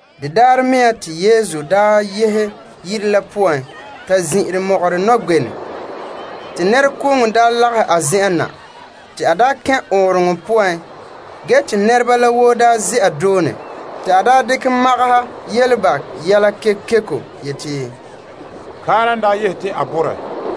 De daarɛ mea te Yesu daa yehe yire la zin'ire mɔgɔrɛ nɔgbenɛ. Te nɛrekooŋɔ lagahɛ a zen'en na, te a kɛn' ɔɔnrɔŋɔ poan ge te nɛreba la woo daa ze'a doone. A dekɛ magaha yele ba yɛla kekeko yeti, Kaara n daa yehe te a bore.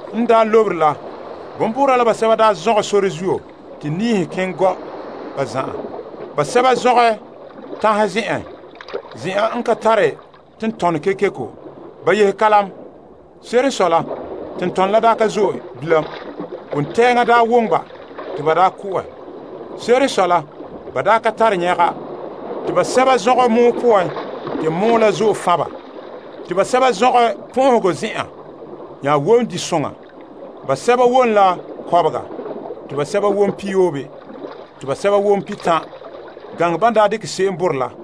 N lobere la, bonbuura la basɛba zɔgɛ sore zuo te niihe keŋɛ gɔ' ba zan'an. Te basɛba zɔgɛ tanhe zen'en, zen'an n ka tare tentɔnɔ kekeko. Ba yehe kalam. Se'ere n sɔe la tentɔnɔ la ka zo'e bilam. Wontɛɛŋa woŋɛ ba te ba ko'ɛ. Se'ere n sɔe la ba daa ka tare nyɛga. Basɛba me zɔgɛ gɔn'ɔhe poan te gɔn'ɔhe la zo'e kpare ba. Ge basɛba zɔgɛ pɔn'ɔhegɔ zen'an nya wom disoŋa te basɛba wom la kɔbega, te sɛba wom pihiyoobe, te sɛba wom pihitan', gaŋɛ ban dekɛ se'em borɛ la.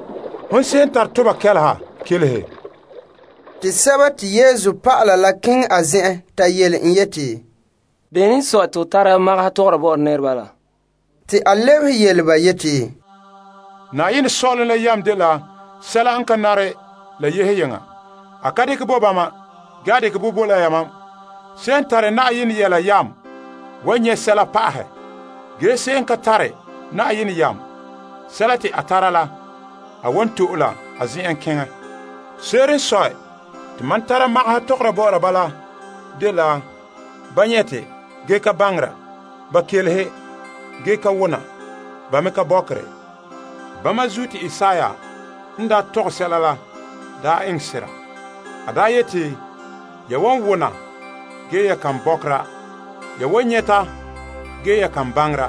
Hon se'em n tare toba kɛleha, kelehe. Te dɔlɔba la keŋɛ a zen'en ta yele en yeti, Bene n sɔe te ho tara magaha tɔgɔra bɔ'ɔra nɛreba la? A lebehe yeti, Saazuo sɔ'ɔlom la yam dela sɛla n ka nare la yehe yeŋa. A ka dekɛ bɔ bo bama ge a dekɛ la bo la yamam. Se'em n tare zo'e la wan nyɛ' pa'ahɛ, ge se'em n ka tare, sɛla te a pon tara la ba wan to'e la a zen'en. Se'ere n sɔe te mam tara magaha tɔgɔra bɔ'ɔra ba la dela: Ba nyɛte ge ka baŋera. Ba kelehe ge ka wona, ba me ka bɔkere. Bama zuo te Isaiah n daa tɔgɛ sɛla la daa enŋ sera. Kelehe ya malom kelehe, ge ya kan malom bɔkɛ. Behɛ ya malom behɛ, ge ya kan malom nyɛ.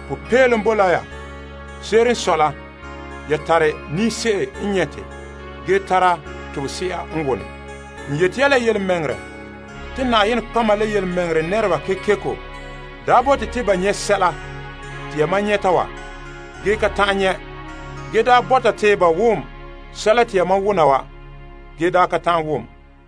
Som boe la ya, ya tare ninse'e n nyɛte ge tara tobese'a n wone la zuo. N yeti ya yelemɛŋɛrɛ te nɔtɔgɔheba la tontɔɔdoma kekeko daa bote te ba nyɛ' sɛla te yamam nyɛta wa ge ka ta'an nyɛ'. Ge be daa le bɔta te ba wom sɛla te yamam wona wa ge ka ta'an wom.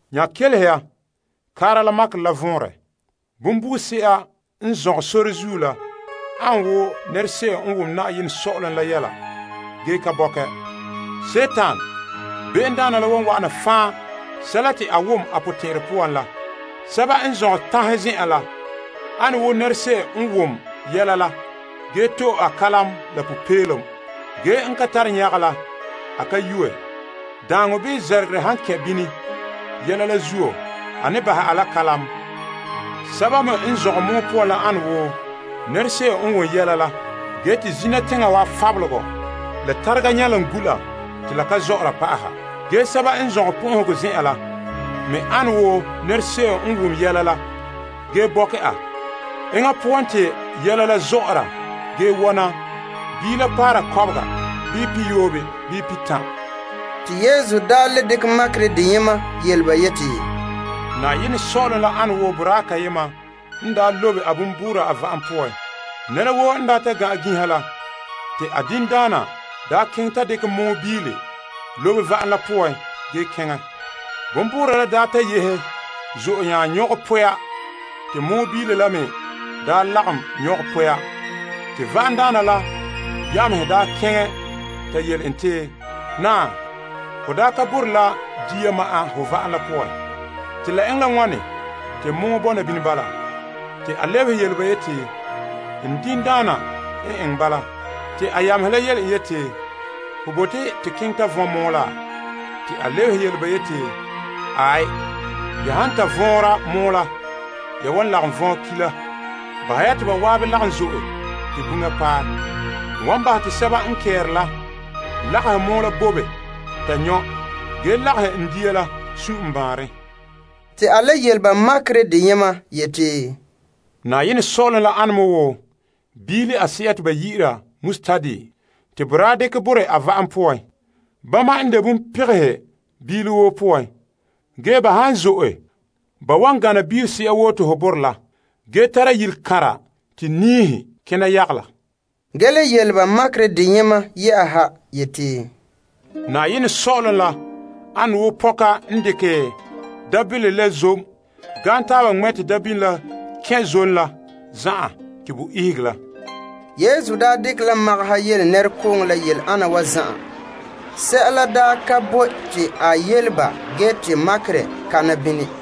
Nananawa kelehe ya kaara la makerɛ la vɔnrɛ. Bonbuuse'a a n zɔgɛ sore zuo la ane wo nɛra se'em n wom sɔ'ɔlom la yelehom ge ka bɔkɛ. Bonbe'a la n wa'ana fan' sɛla te ba bore a suunre poan la. Sɛba n zɔgɛ tanhe zen'en la ane wo nɛra se'em n wom yelehom la ge to'e a kalam la popeelom. Ge a ka yuuɛ, a ka tare nyɛga la zuo. Daaŋɔ bii zɛrɛgerɛ han kɛn' bini, yelehom la zuo, a ne bahɛ a la kalam. Sɛba me n zɔgɛ gɔn'ɔhe poan la ane wo nɛra se'em n wom yelehom la, ge te zina teŋa wa fabelegɔ la tarega nyɛlom gu' la te la ka zɔ'ɔra pa'aha. Ge sɛba n zɔgɛ pɔn'ɔhegɔ zen'an la me ane wo nɛra se'em n wom yelehom la ge bɔkɛ a. Enŋa zɔ'ɔra ge wɔna biila paara kɔbega bii pihiyoobe bii pihitan'! Te Yesu daa le dekɛ makerɛ deyema yele ba yeti, Saazuo sɔ'ɔlom an wo boraa kayema n daa lobe bonbuura a va'am poan. Ge nɛra woo n ta gan'an ginha, a diŋdaana keŋɛ ta dekɛ mɔɔ biile lobe va'am la poan ge keŋɛ. Bonbuura la ta yehe zo'e nya nyɔgɛ poya te mɔɔ biile la me lagom nyɔgɛ poya. Te va'amdaana la yamehe keŋɛ ta yele en yeti, Naa, ho daa ka borɛ la dia ma'an ho va'am la poan? Te la eŋɛ la wane te mɔɔ bɔna nini bala? Te a lebehe yele ba yeti, Diŋdaana n eŋɛ bala. Te yamehe la soke en yeti, Ho bote te keŋɛ ta vɔn' mɔɔ laa? A lebehe yele ba yeti, Aai, ya han ta vɔɔnra mɔɔ la ya wan lagom vɔn' ki' la. Bahɛ ya te ba zan'an lagom zo'e te buŋa paɛ. N wan bahɛ te sɛba n kɛ'ɛre la lagahe mɔɔ la bobe ta nyɔ' ge lagahɛ n dia la sun' n baanren! A le yele ba makerɛ deyema yeti, Saazuo sɔ'ɔlom la ane wo biile ise'e n de biile pegehe te boraa dekɛ borɛ a va'am poan. Bama n de bonpegehe biile woo poan, ge ba han ta zo'e, ba wan gana biilese'a woo te ho borɛ la ge tara yilekanra te niihe kena yagala. Ge a le yele ba makerɛ deyema yeti, Saazuo sɔ'ɔlom la ane wo pɔka n dekɛ mi'ihom la zom gaam taaba ŋmɛ' te mi'ihom la kɛn' zom la zan'an te bo ihege la. Yesu daa dekɛ la magaha yele nɛrekooŋɔ la yele ana wa zan'an. Sɛla ka boe te a yele ba gee te makerɛ kana nini.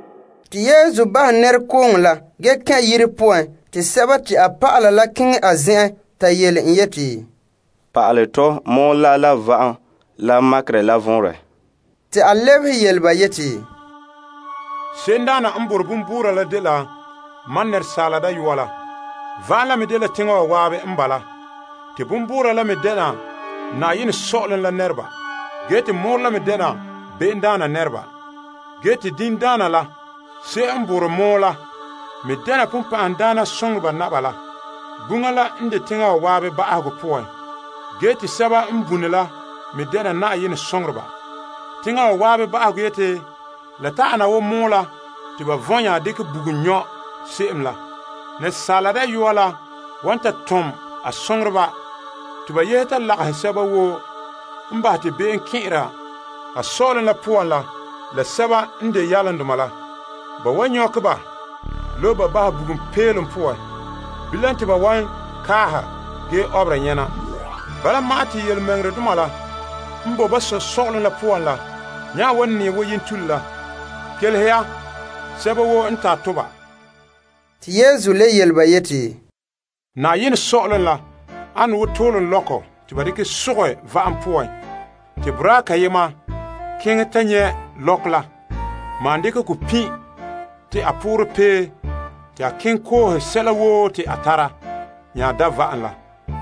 Te Yesu bahɛ nɛrekooŋɔ la gee kɛn' yire poan. Te a dɔlɔba la keŋɛ a zen'en ta yele en yeti, Pa'alɛ tɔ mɔɔ la la va'am la makerɛ la vɔnrɛ. A lebehe yele ba yeti, Se'emdaana n borɛ bonbuura la dela Asaala Dayɔa la. Va'am la me dela teŋa wa zan'an n bala, te bonbuura la me dɛna sɔ'ɔlom la nɛreba. Mɔɔrɔ la me dɛna bonbɛ'a la nɛreba. Ge te diŋdaana la, se'em n borɛ mɔɔ la me dɛna sagona la. Buŋa la n de teŋa wa zan'an ba'ahegɔ poan, gee te sɛba n bune la me dɛna Yenɛ soŋoreba. Teŋa wa zan'an ba'ahegɔ yeti la ta ana wo mɔɔ la te ba vɔn' nya dekɛ bugum nyɔ' se'em la. Asaala Dayɔa la wan ta tom a soŋoreba te ba yehe ta lagahɛ sɛba woo n bahɛ te be'em kɛn'ɛra a sɔ'ɔlom la poan la la sɛba n de yalomdoma la. Ba wan nyɔkɛ ba lobe bahɛ bugum peelom poan. Bilam te ba wan kaaha ge ɔbera nyɛna. Bala ma'an te tontɔɔdoma la n boe ba Sɔ' sɔ'ɔlom la poan la nya wan nɛɛ woo yentule la. Kelehe ya, sɛba woo n ta toba. Saazuo sɔ'ɔlom la an woo toolom lɔkɔ te ba dekɛ sogɛ va'am poan, te boraa kayema keŋɛ ta nyɛ' lɔkɔ la maan dekɛ kɔ pin' te a poorɛ pee te a keŋɛ koohe sɛla woo te a tara nya da' va'am la.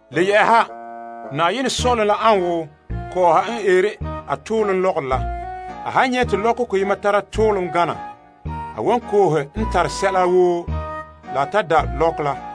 Le yɛ'ɛha, saazuo sɔ'ɔlom la an woo kɔɔha n eere a toolom lɔgɔrɔ la. A han nyɛ' koyema n tare toolom gana, a wan koohe n tare sɛla woo la ta da' ka la.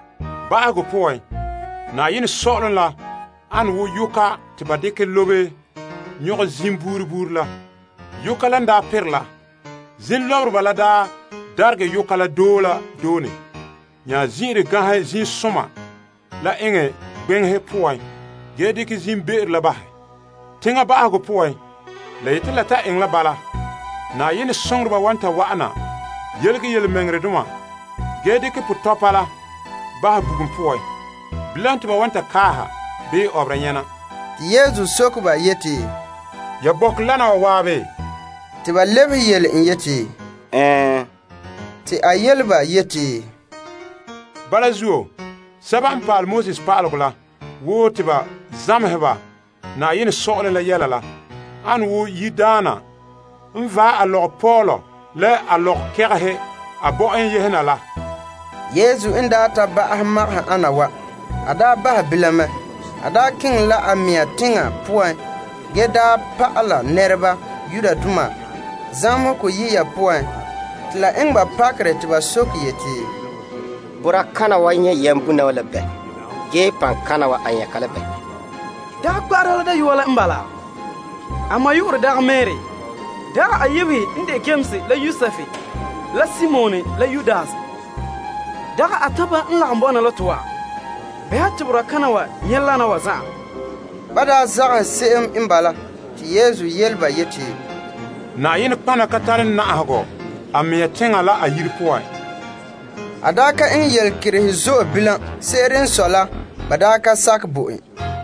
Ba'ahegɔ poan, saazuo sɔ'ɔlom la ane wo yoka te ba dekɛ lobe nyɔgɛ zim buuri buuri la. Yoka la n daa perɛ la, zim lɔbereba la daregɛ yoka la doe la doone nya zin'ire ganhɛ zimsoma la eŋɛ gbeŋehe poan ge dekɛ zimbe'ero la bahɛ. Teŋa ba'ahegɔ poan, la yeti la ta eŋɛ la bala. Yenɛ soŋoreba wan ta wa'ana yelege tontɔɔdoma ge dekɛ potɔpa la bahɛ bugum poan. Bilam te ba wan ta kaaha bii ɔbera nyɛna. Yesu soke ba yeti, Ya bɔkɛ wana wa zan'an? Ba lebehe yele en yeti, Ɛɛn, A yele ba yeti, Bala zuo sɛba n pa'ale pa'alegɔ la woo te ba zamehɛ ba saazuo sɔ'ɔlom la yɛla la ane wo yiredaana n vaɛ a lɔgɔpɔɔlɔ la a lɔgɔkɛgɛhe a bɔ'en yehe na la. Yesu n daa ta ba'ahɛ maga ana wa, a daa bahɛ bilam mɛ. A daa keŋɛ la a mɛŋa teŋa poan ge pɔhɛ pa'alɛ nɛreba zamehegɔ yiya poan, te la eŋɛ ba pakerɛ te ba yeti, Boraa kana wa nyɛ' yambona wa la bɛɛ? Gee paŋkana wa, a nyɛ' ka la bɛɛ? Dagɛ mɛta la dayɔa la n bala? A ma yu'urɛ dagɛ Mari? Dagɛ a yebehe n de Yames la Yosef la Simon la Yudas? Dagɛ a tanpa n lagom bɔna la to wa? Bɛha te boraa kana wa nyɛ' wana wa zan'an. Ban daa zagahɛ en se'em n bala, ge Yesu yele ba yeti, Nɔtɔgɔha ka tare na'ahegɔ a mɛŋa teŋa la a yire poan ma'an. A daa ka eŋɛ yelekerehe zo'e bilam. Se'ere n sɔe la ba daa ka sakɛ bo en.